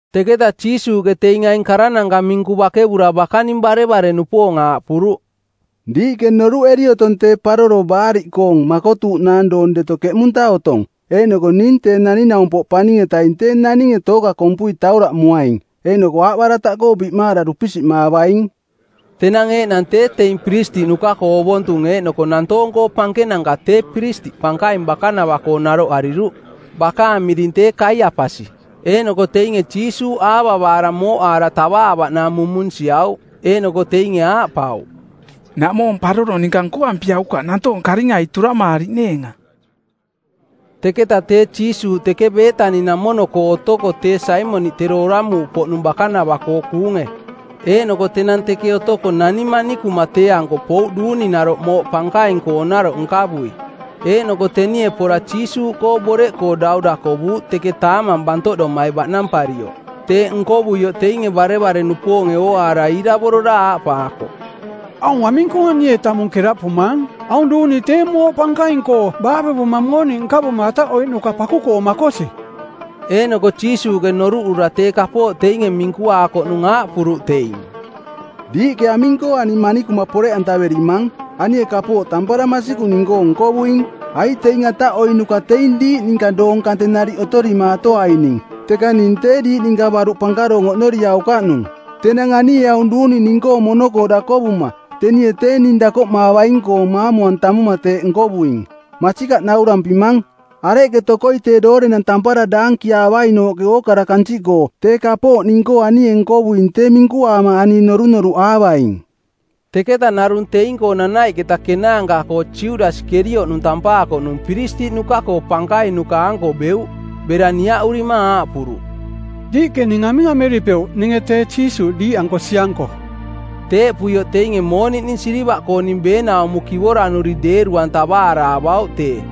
Teketa Jiisuuꞌke teing aing karananka minku bakevura bakaning barevare-nupoong aaꞌpuruꞌ, “Diiꞌke noruꞌeri otong tee Paroro Baariꞌkoong˜ makotuuꞌnaang doong deto keꞌmunta otong, eeꞌnoko ning Tee Naning-naumpoꞌ Paning-etaing tee naninge tooka kompui tauraꞌmuaing, eeꞌnoko aaꞌbarataꞌkoo biꞌmaara dupisiꞌmaavaing.” Tenang eeꞌnang tee teing piristiꞌnuka-koo ovontung eeꞌnoko nantoong-koo pankenanka tee piristiꞌ pankaing bakanava-koo naroꞌariruꞌ, bakaang miring tee Kaiapasi. Eeꞌnoko teinge Jiisuuꞌ aavavaara mooꞌaara tavaavaꞌnaang mumunsiauꞌ. Eeꞌnoko teinge aaꞌpauꞌ, “Naꞌmoo paroro ninka nkoampiaukaꞌ nantoonge karingai turamaariꞌneenga.” Teketa tee Jiisuuꞌ teke Beetani-namono-koo otoko tee Saimoniꞌ tero oramuuꞌpoꞌnung bakanava-koo kuunge. Eeꞌnoko tenang teke otoko nani manikuma tee-anko pouꞌ duuninaroꞌ mooꞌ pankaing-koonaroꞌ nkavui. Eeꞌnoko tenie pora Jiisuuꞌkoo boreꞌkoo dau dakovuuꞌ teke taamang bantoꞌdomai baꞌnamparioꞌ. Teeꞌ nkovuioꞌ teinge barevare-nupoonge ooaara iiravorora aaꞌpaakoꞌ, “Aung aming-koo anie tamung keraꞌpumaang? Aung duuni tee mooꞌ pankaing-koo baavevuma mooniꞌ nkavuma ataꞌoiꞌnuka paku-koo makosi.” Eeꞌnoko Jiisuuꞌke noruꞌura tee kapooꞌ teinge minkuaakoꞌnung aaꞌpuruꞌ teing, “Diiꞌke aming-koo ani manikuma poreꞌantaverimang? Anie tee kapooꞌ tampara masikung ning-koo nkovuing. Aiꞌ teing ataꞌoiꞌnuka teing diiꞌ ninka doong kante nariꞌ otorimaatoaining, teka ning tee diiꞌ ninka baruꞌ pankaroong oꞌnoriaukaꞌnung. Tenang anie aung duuni ning-koo mono-koo dakovuma tenie tee ning dakoꞌmaavaing-koong maamu-antamuma teeꞌ nkovuing. Masikaꞌ naurampimang, areꞌke tokoi tee doorenang tampara daankiaavainooꞌke ookara kansiꞌkoo tee kapooꞌ ning-koo anie nkovuing tee minkuaama ani norunoruꞌaavaing.” Teketa narung teing-koo nanaiꞌketa kenaanka-koo Judasi Kerioꞌnung tampaakoꞌnung, piristiꞌnuka-koo pankainuka-anko beuꞌ. Bera niaꞌurima aaꞌpuruꞌ, “Diiꞌke ning aming ameripeuꞌ ninge tee Jiisuuꞌ diiꞌanko sianko?” Teeꞌpuioꞌ teinge mooniꞌning silivaꞌkooning beenaumo kivoranuri deeru-antavaara avauꞌ tee.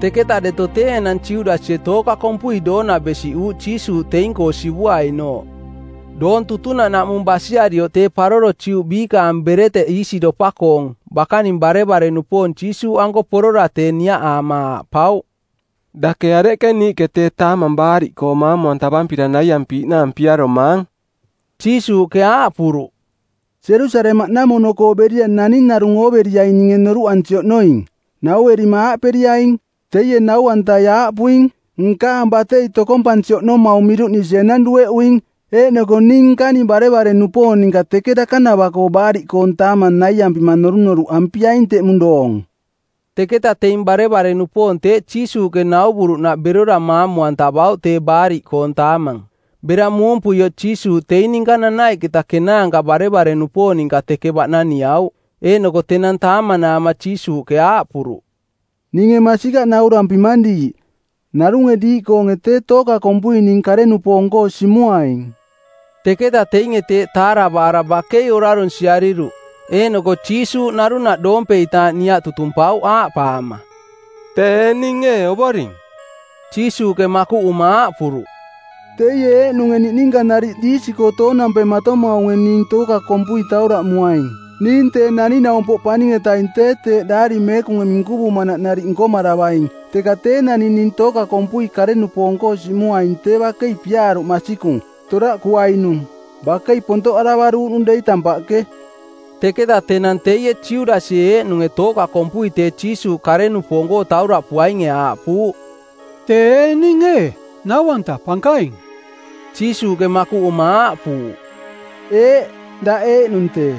Teketa deto tee enang Judasie tooka kompui doona besiꞌuuꞌ Jiisuuꞌ teing-koo sivuainooꞌ. Doong tutunaꞌnaꞌmung basiarioꞌ tee paroro Juꞌ biikaang bereteꞌ iisiropa-koong, bakaning barevare-nupoong Jiisuuꞌanko porora tee niaꞌaama aaꞌpauꞌ, “Dake areꞌke niiꞌke tee Taamang Baariꞌkoong˜ maamu-antavampira naiampiiꞌnaang piaromaang?” Jiisuuꞌke aaꞌpuruꞌ, “Jerusalemaꞌnamono-koo berira naning narung ooveriaing ninge noruꞌansi oꞌnoing. Nauerima aaꞌperiaing, ‘Teie nau-antai aaꞌpuing, “Nkaang batei tokompansi oꞌnomaung miruꞌnisi enang dueꞌuing. Eeꞌnoko ning nkaning barevare-nupoong ninka teke dakanava-koo Baariꞌkoong Taamang naiampima norunoruꞌampiaing teꞌmung doong.”’” Teketa teing barevare-nupoong teeꞌ Jiisuuꞌke nauvuruꞌnaꞌ berora maamu-antavauꞌ tee Baariꞌkoong Taamang. Bera muumpuioꞌ Jiisuuꞌ teing ninka nanaiꞌketa kenaanka barevare-nupoong ninka teke baꞌnaniauꞌ. Eeꞌnoko tenang taamanaama Jiisuuꞌke aaꞌpuruꞌ, “Ninge masikaꞌ naurampimang diiꞌ, narunge diiꞌkoonge tee tooka kompui ning kare-nupoong-koo simuaing.” Teketa teinge teeꞌ taaravaara bakei orarunsiariruꞌ, eeꞌnoko Jiisuuꞌ narunaꞌ doompeitaaꞌ niaꞌ tutumpauꞌ aaꞌpaama, “Tee ee ning ee, Ovoring?” Jiisuuꞌke makuꞌuma aaꞌpuruꞌ, “Teie eeꞌnunge niꞌninka nariꞌ diisi-koo toonampematomaunge ning tooka kompui tauraꞌmuaing. Ning Tee Naning-naumpoꞌ Paning-etaing tee teeꞌ Daari Meekunge minkuvuuꞌnaꞌ nariꞌ nkomaravaing, teka tee naning ning tooka kompui kare-nupoong-koo simuaing tee bakei piaaruꞌ masikung, toraꞌkuainung. Bakei pontoꞌaravaruuꞌnung dei tampaꞌke.” Teketa tenang teie Judasie eeꞌnunge tooka kompui tee Jiisuuꞌ kare-nupoong-koo tauraꞌpuainge aaꞌpuuꞌ, “Tee ee ning ee, Nau-anta Pankaing?” Jiisuuꞌke makuꞌuma aaꞌpuuꞌ, “Eeꞌ, daꞌ eeꞌnung tee.”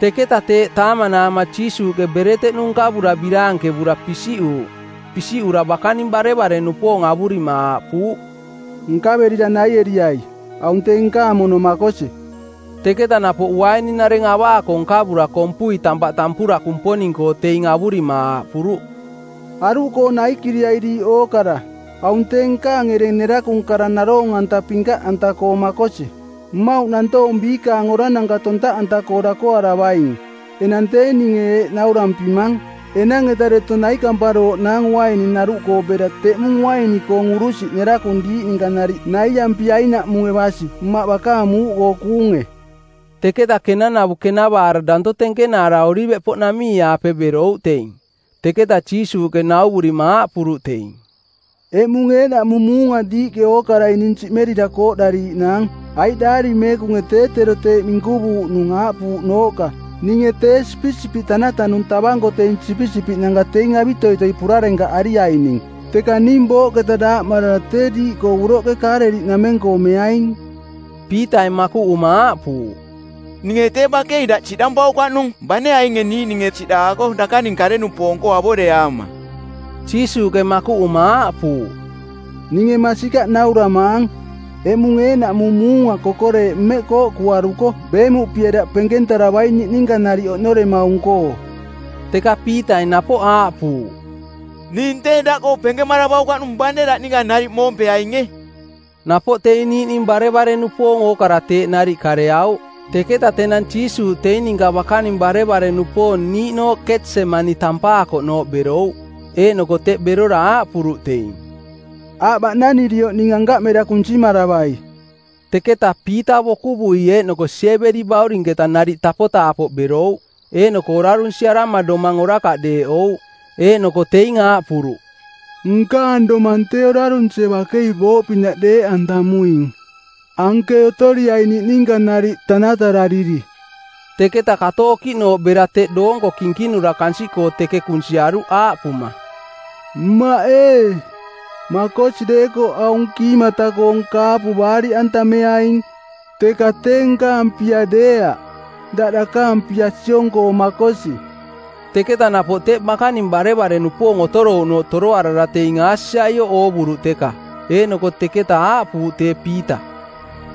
Teketa teeꞌ taamanaama Jiisuuꞌke bereteꞌnu nkavura, biraankevura, pisiꞌuuꞌ. Pisiꞌura bakaning barevare-nupoong avurima aaꞌpuuꞌ, “Nkaverira naieriai, aung tee nkaang mono makosi.” Teketa napoꞌ uaininareng avaako nkavura kompui tampaꞌ tampura Kumponing-koo teing avurima aaꞌpuruꞌ, “Aruꞌkoo naikiriai diiꞌ ookara. Aung tee nkaang ereng nerakung kara naroong-anta pinkaꞌanta-koong makosi, mmauꞌ nantoong biikaang orarananka tontaꞌanta-koo dakoaravaing. Enang tee ninge eeꞌ naurampimang, enang-eta deto naikamparooꞌnaang uaininaruꞌkoo bera teꞌmung uaini-koong urusiꞌ nerakung diiꞌ ninka nariꞌ naiampiainaꞌmunge basi Mmaꞌ bakaang muuꞌkoo kuunge.” Teketa kenanavu kenavaara danto tenkenaara Oliveꞌpoꞌnamii-aape berouꞌ teing. Teketa Jiisuuꞌke nauvurima aaꞌpuruꞌ teing, “Eꞌmung eeꞌnaꞌmung muunga diiꞌke ookarai ning siꞌmerira kooꞌdariiꞌnaang, aiꞌ Daari Meekunge tee tero teeꞌ minkuvuuꞌnung aaꞌpuuꞌnooꞌka, ‘Ninge tee sipisipiꞌ tanatanung tavanko teing sipisipiꞌnanka teing avitoitoi purarenkaꞌariaining.’ Teka ning booꞌketa daaꞌmarara tee diiꞌkoo uroꞌke Kaaleliꞌnameng-koo meaing.” Piitai makuꞌuma aaꞌpuuꞌ, “Ninge tee bakei daꞌ siꞌdampaukaꞌnung bane ainge niiꞌninge siꞌdaako dakaning kare-nupoong-koo avoreaama.” Jiisuuꞌke makuꞌuma aaꞌpuuꞌ, “Ninge masikaꞌ nauramaang, eꞌmung eeꞌnaꞌmung muunga kokoreeꞌ mmeꞌ kooꞌkuaruko beemuꞌpie daꞌ penkentaravaing niꞌninka nariꞌ oꞌnoremaung-koo.” Teka Piitai napoꞌ aaꞌpuuꞌ, “Ning tee daꞌkoo penkemaravaukaꞌnung bane daꞌ ninka nariꞌ moompeainge.” Napoꞌ teing niiꞌning barevare-nupoong ookara teeꞌ nariꞌ kareauꞌ. Teketa tenang Jiisuuꞌ teing ninka bakaning barevare-nupoong niiꞌnooꞌ Ketsemani tampaakoꞌnooꞌ berouꞌ, eeꞌnoko teꞌ berora aaꞌpuruꞌ teing, “Aꞌ baꞌnanirioꞌ ning ankaꞌ mera kunsimaravai.” Teketa Piita bokuvui eeꞌnoko Siebedi-baurinketa nariꞌ tapotaapoꞌ berouꞌ, eeꞌnoko orarunsiarama domang orakaꞌ deeꞌouꞌ. Eeꞌnoko teing aaꞌpuruꞌ, “Nkaang domang tee orarunsie bakei booꞌpinaꞌ deeꞌantamuing. Anke otoriai niꞌninka nariꞌ tanatarariri.” Teketa kato okiꞌnooꞌ bera teꞌ doonko kinkinura kansiꞌkoo teke kunsiaruꞌ aaꞌpuma, “Mmaꞌ ee, makosi deekoꞌ aung kiimata-koong kaapu baariꞌantameaing, teka tee nkaang pia deeaꞌ, daꞌ dakaang pia siong-koo makosi.” Teketa napoꞌ teꞌ bakaning barevare-nupoong otorouꞌnooꞌ toroarara teing aasiaioꞌ oovuruꞌ teka. Eeꞌnoko teketa aaꞌpuuꞌ tee Piita,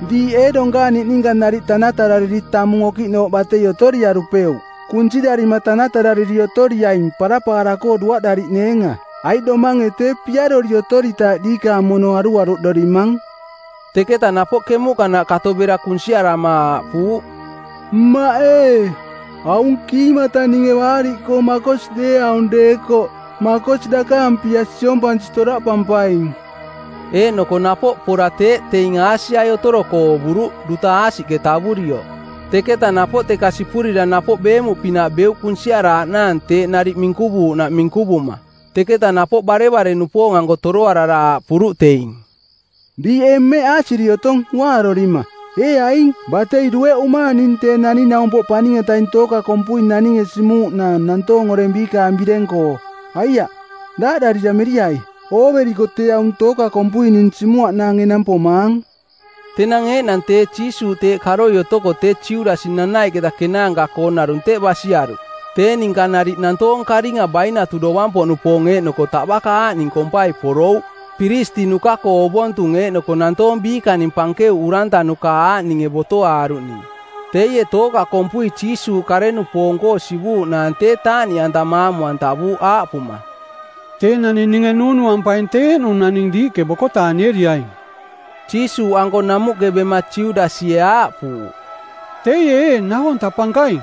“Diiꞌ ee donkaang niꞌninka nariꞌ tanatarariri tamung okiꞌnooꞌ batei otoriarupeuꞌ? Kunsirarima tanatarariri otoriaing parapaara-koo duaꞌdariꞌneenga, aiꞌ domange tee piarori otoritaaꞌ diikaang mono aruaruꞌdorimang.” Teketa napoꞌ kemuꞌkanaꞌ kato bera kunsiarama aaꞌpuuꞌ, “Mmaꞌ ee, aung kiimata ninge baariꞌkoo makosi deeaung deekoꞌ, makosi dakaang pia siompansi toraꞌpampaing.” Eeꞌnoko napoꞌ pora teeꞌ teing aasiai otoroko oovuruꞌ, duta aasiꞌke tavurioꞌ. Teketa napoꞌ teka sipurira napoꞌ beemuꞌpinaꞌ beuꞌ kunsiaraaꞌnaang teeꞌ nariꞌ minkuvuuꞌnaꞌ minkuvuma. Teketa napoꞌ barevare-nupoong-anko toroarara aaꞌpuruꞌ teing, “Diiꞌ ee mmeꞌ aasiri otong uaarorima? Ee aing, batei dueꞌumaang ning Tee Naning-naumpoꞌ Paning-etaing tooka kompui naninge simuuꞌnaang nantoong oreng biikaang bireng-koo. Aiaꞌ, daaꞌdarira meriai. Ooveriko tee aung tooka kompui ning simuaꞌnaang enang pomaang.” Tenang eeꞌnang tee Jiisuuꞌ teeꞌ karoi otoko tee Judasi nanaiꞌketa kenaanka-koong narung teꞌ basiaruꞌ. Tee ninka nariꞌ nantoong karinga bainatu dovang-poꞌnupoong eeꞌnoko taꞌbaka aaꞌning kompai porouꞌ, piristiꞌnuka-koo ovontung eeꞌnoko nantoong biikaning pankeuꞌ urantanuka aaꞌninge botoaaruꞌning. Teie tooka kompui Jiisuuꞌ kare-nupoong-koo sivuuꞌnaang tee taaꞌniꞌanta maamu-antavuuꞌ aaꞌpuma, “Tee naning ninge nuunuampaing tee eeꞌnung naning diiꞌke bokotaanieriaing.” Jiisuuꞌanko namuꞌke bema Judasie aaꞌpuuꞌ, “Teie ee Nau-anta Pankaing!”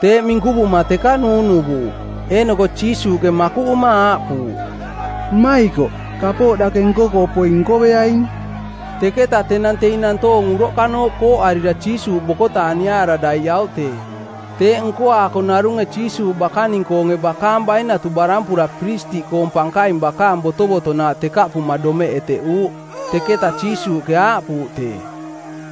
Teeꞌ minkuvuma teka nuunuvuuꞌ. Eeꞌnoko Jiisuuꞌke makuꞌuma aaꞌpuuꞌ, “Mmaikoꞌ, kapooꞌ dake nko-koo poing nkoveaing.” Teketa tenang teing nantoong uroꞌkanooꞌ kooꞌarira Jiisuuꞌ bokotaaniaara daiꞌauꞌ tee. Teeꞌ nkoaako narunge Jiisuuꞌ bakaning-koonge bakaang bainatu barampura piristiꞌkoong pankaing bakaang botovotonaaꞌ tekaꞌpuma domeꞌ eteꞌuuꞌ. Teketa Jiisuuꞌke aaꞌpuuꞌ tee,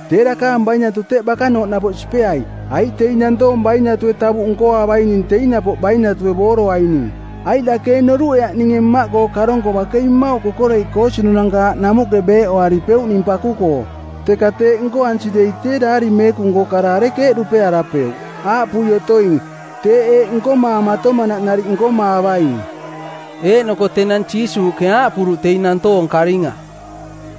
“Tee dakaang bainatu teꞌ bakanooꞌ napoꞌ sipeai, aiꞌ teing nantoong bainatue tavuꞌ nkoaavaining teing napoꞌ bainatue booroaining. Aiꞌ dake ee noruꞌeaꞌ ninge Mmaꞌkoo karonko bakei mmauꞌ kokoreiꞌ koosinunanka aaꞌ namuꞌke beeꞌoaripeuꞌ ning paku-koo? Teka teeꞌ nkoansi dei tee Daari Meekung-koong kara arekeeꞌ dupearapeuꞌ, aaꞌpui otoing, teeꞌ eeꞌ nkomaamatomanaꞌ nariꞌ nkomaavaing?” Eeꞌnoko tenang Jiisuuꞌke aaꞌpuruꞌ teing nantoong karinga,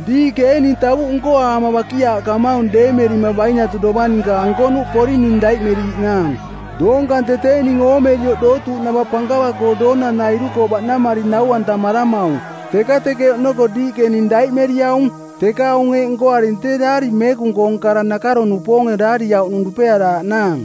“Diiꞌke ee ning tavuꞌ nkoaama bakiaaꞌkamaung deemerima bainatu dovang ninka ankonuꞌ poring ning daiꞌmeriiꞌnaang? Doong kante tee ning oomerioꞌ dootuuꞌnava pankava-koo doonanairu-koo baꞌnamari nau-antamaramaung, teka teke oꞌnoko diiꞌke ning daiꞌmeriaung. Teka aung eeꞌ nkoaring tee Daari Meekung-koong kara nakaro-nupoonge daariauꞌnung dupearaaꞌnaang.”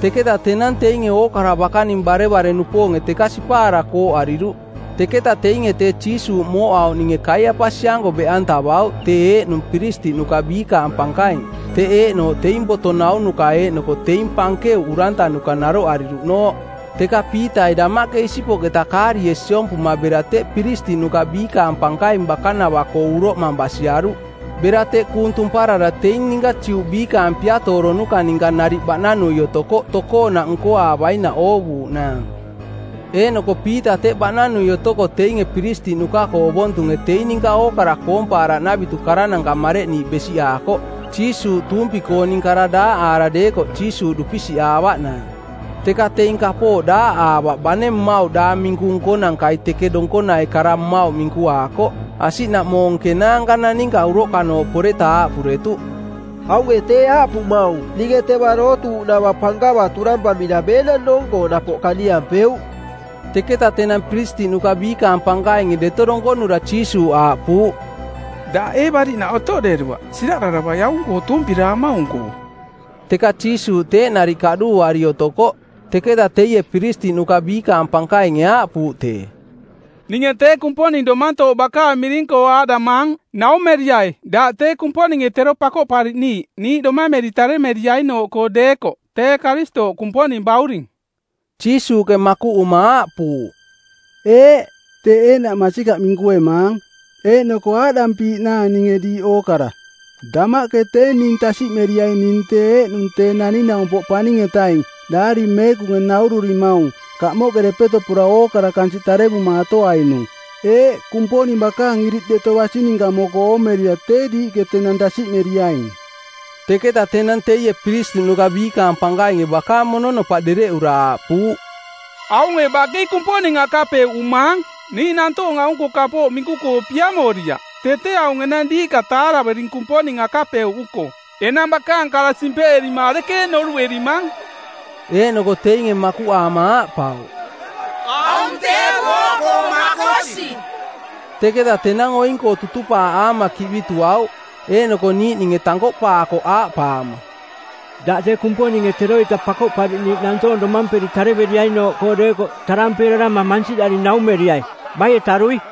Teketa tenang teinge ookara bakaning barevare-nupoonge teka sipaara kooꞌariruꞌ. Teketa teinge tee Jiisuuꞌ mooꞌauꞌninge Kaiapasi-anko beꞌantavauꞌ tee eeꞌnung piristiꞌnuka biikaang pankaing, teꞌ eeꞌnooꞌ teing boto naunuka eeꞌnoko teing pankeuꞌ urantanuka naroꞌariruꞌnooꞌ. Teka Piitai damaꞌke isipoꞌketa kaarie sipuma bera teꞌ piristiꞌnuka biikaang pankaing bakanava-koo uroꞌmang basiaruꞌ. Bera teꞌ kuung tumparara teing ninka Juꞌ biikaang piatooronuka˜ ninka nariꞌ baꞌnanui otokoꞌ tokoonaꞌ nkoaavainaꞌ oovuuꞌnaang. Eeꞌnoko Piita teꞌ baꞌnanui otoko teinge piristiꞌnuka-koo ovontunge teing ninka ookara koompaaraꞌnavitu karananka mareꞌniiꞌ besiꞌaakoꞌ Jiisuuꞌ tuumpi-kooning kara daaꞌaara deekoꞌ Jiisuuꞌ dupisiꞌaavaꞌnaang. Teka teing kapooꞌ daaꞌaavaꞌ bane mmauꞌ daang minku nkonankai teke donkonai kara mmauꞌ minkuaakoꞌ. Asiꞌnaꞌmoong kenaanka naninka uroꞌkanooꞌ poreta aaꞌpuretuꞌ, “Aunge tee aaꞌpumaung, ‘Ninge teva dootuuꞌnava pankava turampamira beenang doong-koo napoꞌ kaniampeuꞌ.’” Teketa tenang piristiꞌnuka biikaang pankainge deto donkonura Jiisuuꞌ aaꞌpuuꞌ, “Daꞌ ee bariꞌnaꞌ otoꞌderuaꞌ? Siraꞌdaravai aung-koo tuumpiramaung-koo!” Teka Jiisuuꞌ teeꞌ nariꞌ kaꞌduuari otokoꞌ. Teketa teie piristiꞌnuka biikaang pankainge aaꞌpuuꞌ tee, “Ninge tee Kumponing domantooꞌ bakaang miring-koo aaꞌdamaang, naumeriai daꞌ tee Kumponinge tero Pakoꞌpariꞌniiꞌ niiꞌ domameri taremeriainooꞌkoo deekoꞌ, tee Karistooꞌ, Kumponing Bauring.” Jiisuuꞌke makuꞌuma aaꞌpuuꞌ, “Eeꞌ, teeꞌ eeꞌnaꞌ masikaꞌ minkuemaang. Eeꞌnoko aaꞌdampiiꞌnaang ninge diiꞌ ookara: Damaꞌke tee ning tasiꞌmeriaing ning tee eeꞌnung Tee Naning-naumpoꞌ Paning-etaing Daari Meekunge naururimaung kamoꞌke depeto pora ookara kansiꞌ tarevumaatoainung. Eeꞌ, Kumponing bakaang iriꞌ deto basi ninka moko oomerira tee diiꞌke tenang tasiꞌmeriaing.” Teketa tenang teie piristiꞌnuka biikaang pankainge bakaang mononopaꞌ dereꞌura aaꞌpuuꞌ, “Aunge bakei Kumponing akapeuꞌumaang! Niiꞌ nantoong aung-koo kapooꞌ minku-koo piamoriaꞌ. Tee tee aung enang diiꞌka taaravering Kumponing akapeuꞌuko. Enang bakaang kara simpeꞌerima arekeeꞌ noruꞌerimang?” Eeꞌnoko teinge makuꞌaama aaꞌpauꞌ, “Aung tee booꞌkoo makosi.” Teketa tenang oing-koo tutupaaꞌaama kiꞌbituauꞌ. Eeꞌnoko niiꞌninge tankoꞌpaakoꞌ aaꞌpaama, “Daꞌ tee Kumponinge teroita Pakoꞌpariꞌniiꞌ nantoong domamperi tareveriainooꞌkoo deekoꞌ tarampeerarama˜ mansiꞌdari naumeriai baie tarui?”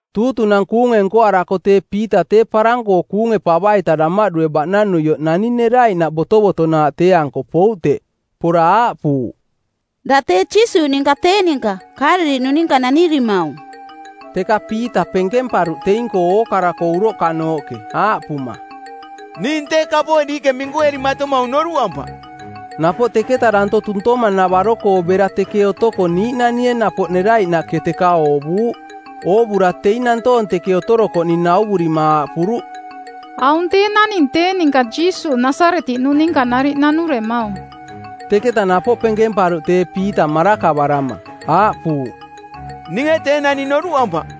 Tuutunang˜ kuunge nkoarako tee Piita tee parang-koo kuunge pava-ita damaꞌdue baꞌnanuioꞌ nani neraiꞌnaꞌ botovotonaaꞌ tee-anko pouꞌ teꞌ. Pora aaꞌpuuꞌ, “Daꞌ tee Jiisuuꞌ ninka tee ninka Kaaleliꞌnung ninka nanirimaung.” Teka Piita penkemparuꞌ teing-koo ookara-koo uroꞌkanooꞌke, aaꞌpuma, “Ning tee kapooꞌ diiꞌke minkuerimatomaung noruꞌampaꞌ.” Napoꞌ teketa danto tuntoma-navaro-koo bera teke otoko niiꞌnanie napoꞌ neraiꞌnaꞌke teka oovuuꞌ. Oovura teing nantoong teke otorokoꞌning nauvurima aaꞌpuruꞌ, “Aung tee naning tee ninka Jiisuuꞌ Nasaretiꞌnung ninka nariꞌ nanuremaung.” Teketa napoꞌ penkemparuꞌ tee Piita marakavarama; aaꞌpuuꞌ, “Ninge tee naning noruꞌampaꞌ,”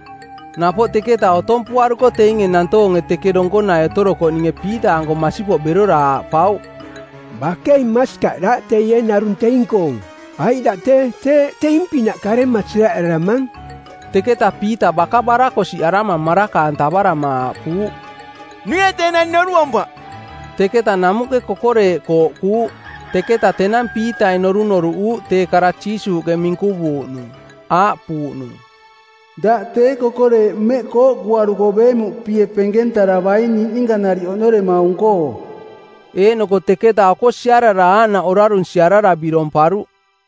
Napoꞌ teketa otompuaruko teinge nantoonge teke donkonai otorokoꞌninge Piita-anko masipoꞌ berora aaꞌpauꞌ, “Bakei masikaꞌ daꞌ teie narung teing-koong, aiꞌ daꞌ tee teeꞌ teing-pinaꞌ karema siraꞌdaramang.” Teketa Piita baka barakosiꞌarama maraka-antavarama aaꞌpuuꞌ, “Ninge tee naning noruꞌampaꞌ!” Teketa namuꞌke kokoreeꞌ kooꞌkuuꞌ. Teketa tenang Piitai norunoruꞌuuꞌ tee kara Jiisuuꞌke minkuvuuꞌnung, aaꞌpuuꞌnung, “Daꞌ tee kokoreeꞌ mmeꞌ kooꞌkuaruko beemuꞌpie penkentaravaing niꞌninka nariꞌ oꞌnoremaung-koo.” Eeꞌnoko teketa oko siarara aaꞌnaꞌ orarunsiarara biromparuꞌ.